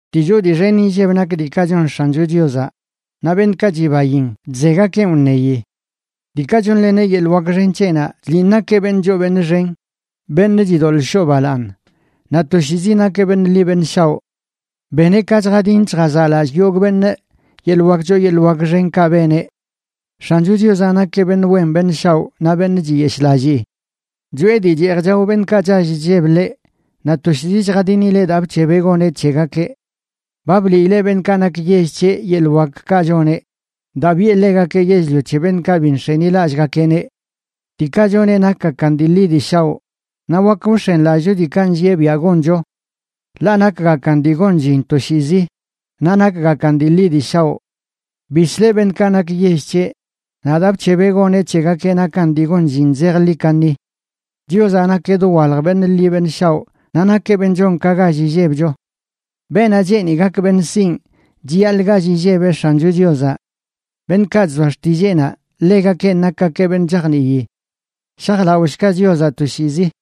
Dii choo dii xen inlleb nak diikaꞌ chon X̱ancho Chiozaꞌ, naꞌ beṉꞌkaꞌ chibain chzegakeꞌn wṉeyi. Diikaꞌ chonleneꞌ yeḻꞌ wak xen c̱heꞌnaꞌ chliꞌn nakeꞌ beṉꞌ choo beṉꞌ xen, beṉꞌ chidoḻꞌ shoꞌ balaaṉ, naꞌ toshiizi nakeꞌ beṉꞌ ḻi beṉꞌ shaoꞌ. Beneꞌ ka chjadin chjazaꞌlallꞌ yogꞌ beṉꞌ yeḻꞌ wak choo yeḻꞌ wak xenkaꞌ beneꞌ. X̱ancho Chiozaꞌ nakeꞌ beṉꞌ wen beṉꞌ shaoꞌ naꞌ beṉꞌ chiyeshꞌlallii. Choꞌe dii cheej chao beṉꞌkaꞌ chall chlleb ḻeꞌ, naꞌ toshiizi chjadinileꞌ daa bc̱hebeꞌ goneꞌ c̱hegakeꞌ. Ba bliileꞌ beṉꞌkaꞌ nak yell c̱heꞌ yeḻꞌ wakkaꞌ choneꞌ daa biꞌe ḻegakeꞌ yell-lio c̱he beṉꞌkaꞌ bi nx̱enilallꞌgakeꞌneꞌ. Diikaꞌ choneꞌ nakgakan dii ḻi dii shaoꞌ, naꞌ wak wx̱enlallꞌcho diikaꞌ nllieꞌ biaꞌ goncho. Ḻaꞌ nakgakan dii gon llin toshiizi, naꞌ nakgakan dii ḻi dii shaoꞌ. Bisleꞌ beṉꞌkaꞌ nak yell c̱heꞌ, naꞌ daa bc̱hebeꞌ goneꞌ c̱hegakeꞌ nakan dii gon llin zejḻi kaṉi. Chiozaꞌ nakeꞌ dowalj beṉꞌ liꞌ beṉꞌ shaoꞌ naꞌ nakeꞌ beṉꞌ chon ka gall illebcho. Beenaꞌ cheeni gak beṉꞌ sinꞌ, chiyaḻꞌ gall illebeꞌ X̱ancho Chiozaꞌ. Beṉꞌkaꞌ chzoa xtilleenaꞌ, ḻegakenꞌ nakgakeꞌ beṉꞌ chajnii. Shajlaꞌoshga Chiozaꞌ toshiizi.